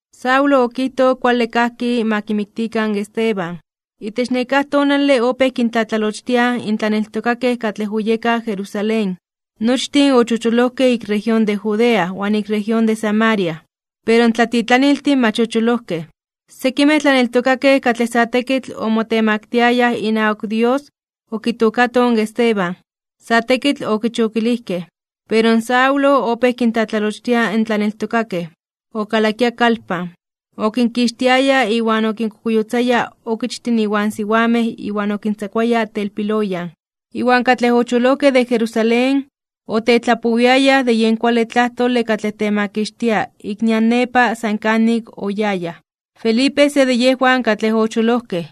Saulo okijtoj kuale kajki ma kimiktikan in Esteban. Itech nekáj tonale opéj kintlatlalochtiaj in tlaneltokakej katlej oyekaj Jerusalén. Nochtin ochocholojkej ik región de Judea iwan ik región de Samaria, pero in tlatitlaniltin mach ocholojkej. Sekimej tlaneltokakej katlej sa tekitl omotemaktiayaj inawak Dios okitookatoj in Esteban. Sa tekitl okichokilijkej. Pero in Saulo opéj kintlatlalochtia in tlaneltokakej. Okalakia kalpan, okinkixtiaya iwan okinkokuyotzaya okichtin iwan siwamej iwan okintzakuaya telpiloyan. Iwan katlej ochocholojkej de Jerusalén, otetlapowiayaj de yen kuale tlajtole katlej temakixtia ik nian nepa san kanik oyayaj. Felipe, se de yejwan katlej ocholojkej,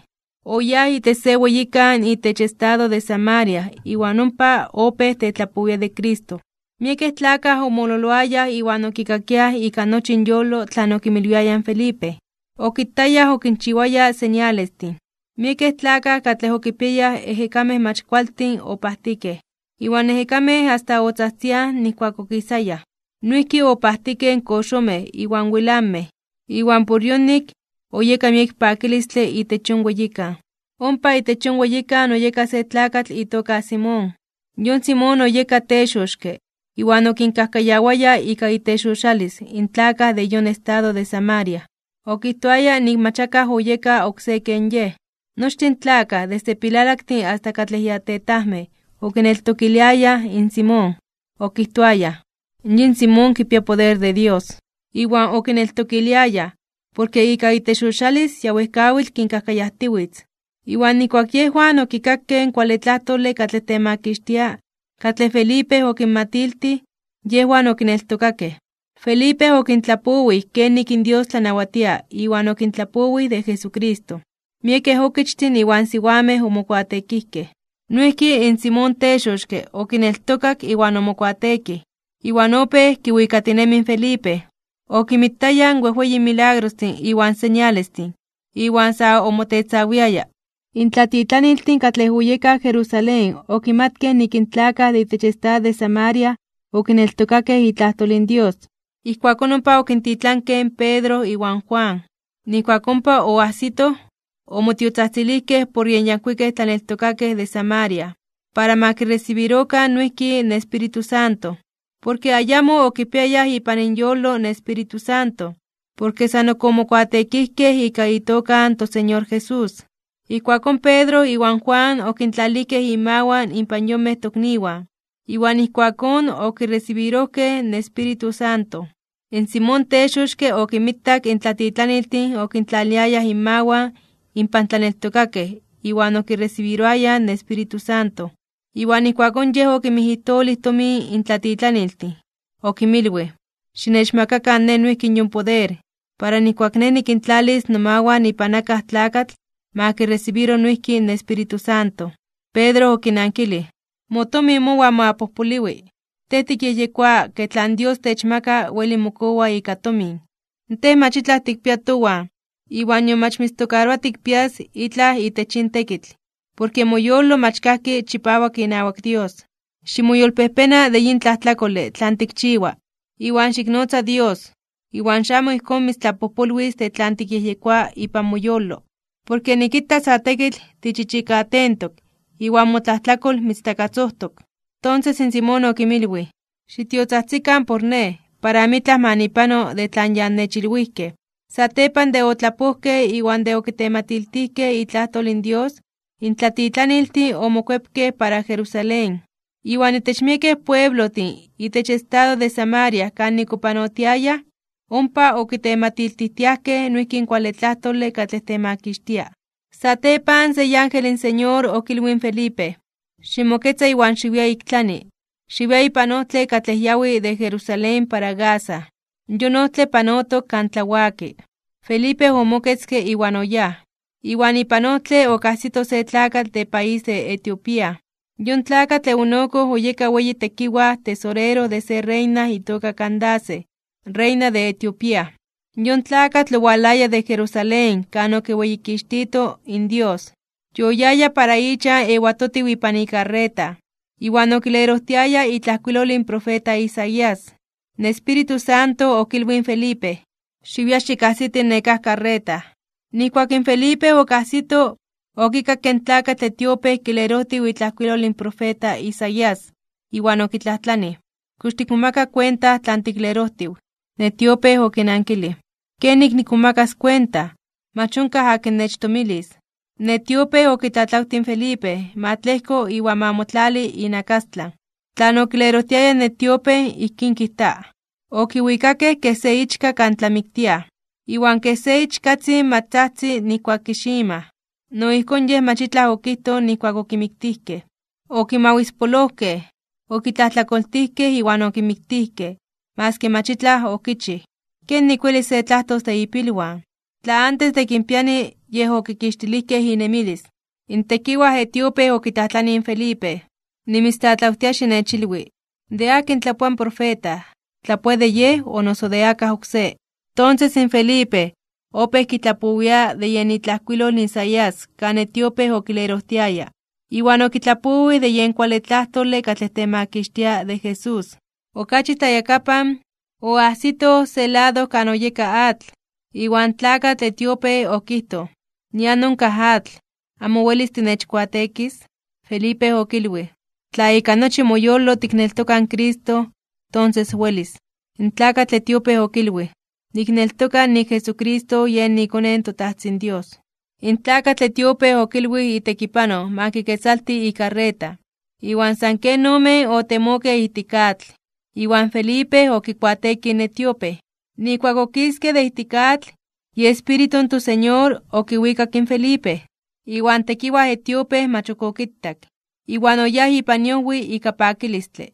oyáj itech se weyikan itech estado de Samaria iwan ompa opéj tetlapowia de Cristo. Miekej tlakaj omololoayaj iwan okikakiaj ika nochi inyolo tlan okinmilwiaya in Felipe. Okitayaj okinchiwaya señalestin. Miekej tlakaj katlej okipiayaj ejekamej mach kualtin opajtikej, iwan ejekamej asta otzajtziaj nijkuak okisayaj. Noijki opajtikej in koxomej iwan wilanmej (temetlamej). Iwan por yonik, oyeka miek pakilistle itech yon weyikan. Ompa itech yon weyikan oyeka se tlakatl itoka Simón. Yon Simón oyeka texoxke (brujo) iwan okinkajkayawaya ika itexoxalis (ibrujería) in tlakaj de yon estado de Samaria. Okijtoaya nik mach akaj oyeka oksé ken yej. Nochtin in tlakaj, desde pilalaktin asta katlej ya tetajmej okineltokiliayaj in Simón. Okijtoayaj: ―Yin Simón kipia poder de Dios. Iwan okineltokiliayaj, porke ika itexoxalis ya wejkawitl kinkajkayajtiwitz. Iwan nijkuak yejwan okikakej in kuale tlajtole katlej temakixtia katlej Felipe okinmatiltij, yejwan okineltokakej. Felipe okintlapowij kenik in Dios tlanawatia iwan okintlapowij de Jesucristo. Miekej okichtin iwan siwamej omokuateekijkej. Noijki in Simón texoxke okineltokak iwan omokuateekij, iwan opéj kiwikatinemi in Felipe. Okinmitaya in wejweyin milagrostin iwan señalestin, iwan sa omotetzawiaya. In tlatitlaniltin katlej oyekaj Jerusalén okimatkej nik in tlakaj de itech estado de Samaria okineltokakej itlajtol in Dios. Ijkuakón ompa okintitlankej in Pedro iwan Juan. Nijkuak ompa oajsitoj, omotiotzajtzilijkej por yen yankuikej tlaneltokakej de Samaria, para ma kiresibirokan noijki in Espíritu Santo. Porke ayamo okipiayaj ipan inyolo in Espíritu Santo, porke san ok omokuateekijkej ika itoka in toSeñor Jesús. Ijkuakón Pedro iwan Juan okintlalijkej inmawan inpan yonmej tokniwan, iwan ijkuakón okiresibirojkej in Espíritu Santo. In Simón texoxke okinmitak in tlatitlaniltin okintlaliayaj inmawan inpan tlaneltokakej iwan okiresibiroayaj in Espíritu Santo. Iwan ijkuakón yej okinmijijtolij tomin in tlatitlaniltin. Okinmilwij: ―Xinechmakakan nej noijki yon poder, para nijkuak nej nikintlalis nomawan ipan akaj tlakatl, ma kiresibiro noijki in Espíritu Santo. Pedro okinankilij: ―¡Motomin mowan ma pojpoliwi! Tej tikyejyekoa ke tlan Dios techmaka weli mokowa ika tomin. Tej mach itlaj tikpia towan iwan nion mach mitztokaroa tikpias itlaj itech yin tekitl, porke moyolo mach kajki chipawak inawak Dios. Ximoyolpejpena (ximoyolkuepa) de yin tlajtlakole tlan tikchiwa, iwan xiknotza in Dios, iwan xamo ijkón mitztlapojpolwis de tlan tikyejyekoa ipan moyolo. Porke nikita sa tekitl tichichikatentok iwan motlajtlakol mitztakatzojtok. Tonses in Simón okinmilwij: ―Xitiotzajtzikan por nej, para amitlaj ma nipano de tlan ya annechilwijkej. Satepan de otlapojkej iwan de okitematiltijkej itlajtol in Dios, in tlatitlaniltin omokuepkej para Jerusalén. Iwan itech miekej pueblojtin itech estado de Samaria kanik opanotiayaj, ompa okitematiltijtiajkej noijki in kuale tlajtole katlej temakixtia. Satepan se iángel in Señor okilwij in Felipe: ―Ximoketza iwan xiwia ik tlani. Xiwia ipan ojtle katlej yawi de Jerusalén para Gaza. Yon ojtle panotok kan tlawaki. Felipe omoketzke iwan oyáj. Iwan ipan ojtle okajsito se tlakatl de país de Etiopía. Yon tlakatl eunuco oyeka weyi tekiwaj tesorero de se reina itoka Candace, reina de Etiopía. Yon tlakatl owalaya de Jerusalén kan okiweyikixtito in Dios. Yoyaya para ichan ewatotiw ipan ikarreta, iwan okilerojtiaya itlajkuilol in profeta Isaías. In Espíritu Santo okilwij in Felipe: ―Xiwia xikajsiti nekáj karreta. Nijkuak in Felipe okajsito, okikakke in tlakatl etiope kilerojtiw itlajkuilol in profeta Isaías, iwan okitlajtlanij: ―¿Kox tikmomaka kuenta tlan tiklerojtiw? In etiope okinnankilij: ―¿Kenik nikmomakas kuenta? Mach onkaj akin nechtomilis. In etiope okitlatlawtij in Felipe ma tlejko iwan ma motlali inakastlan. Tlan okilerojtiaya in etiope, ijkín kijta: Okiwikakej kej se ichka kan tlamiktiaj. Iwan kej se ichkatzin mach tzajtzi nijkuak kiximaj, no ijkón Yej mach itlaj okijtoj nijkuak okimiktijkej. Okimawispolojkej, okitlajtlakoltijkej iwan okimiktijkej maski mach itlaj okichij. ¿Kenik welis se tlajtos de ipilwan? Tla antes de kinpiani yej okikixtilijkej inemilis. In tekiwaj etiope okitlajtlanij in Felipe: ―Nimitztlatlawtia xinechilwi, ¿de akin tlapoa in profeta, tlapoa de yej o noso de akaj oksé? Tonses in Felipe, opéj kitlapowia de yen itlajkuilol Isaías kan etiope okilerojtiaya, iwan okitlapowij de yen kuale tlajtole katlej temakixtia de Jesús. Okachi tlayakapan, oajsitoj se lado kan oyeka atl, iwan tlakatl etiope okijtoj: ―Nian onkaj atl, ¿amo welis tinechkuateekis? Felipe okilwij: ―Tla ika nochi moyolo tikneltoka in Cristo, tonses welis. In tlakatl etiope okilwij: ―Nikneltoka nik in Jesucristo yen iKone in toTajtzin Dios. In tlakatl etiope okilwij itekipanoj ma kiketzalti ikarreta, iwan san ken omen otemokej ijtik atl, iwan Felipe okikuateekij in etiope. Nijkuak okiskej de ijtik atl, iEspíritu in toSeñor okiwikak in Felipe, iwan tekiwaj etiope mach ok okitak, iwan oyáj ipan iojwi ika pakilistle.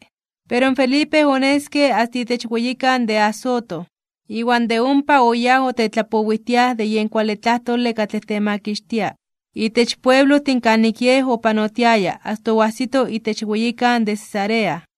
Pero in Felipe oneske asta itech weyikan de Azoto, iwan de ompa oyáj otetlapowijtiaj de yen kuale tlajtole katlej temakixtia itech pueblojtin kanik yej opanotiaya asta oajsito itech weyikan de Cesarea.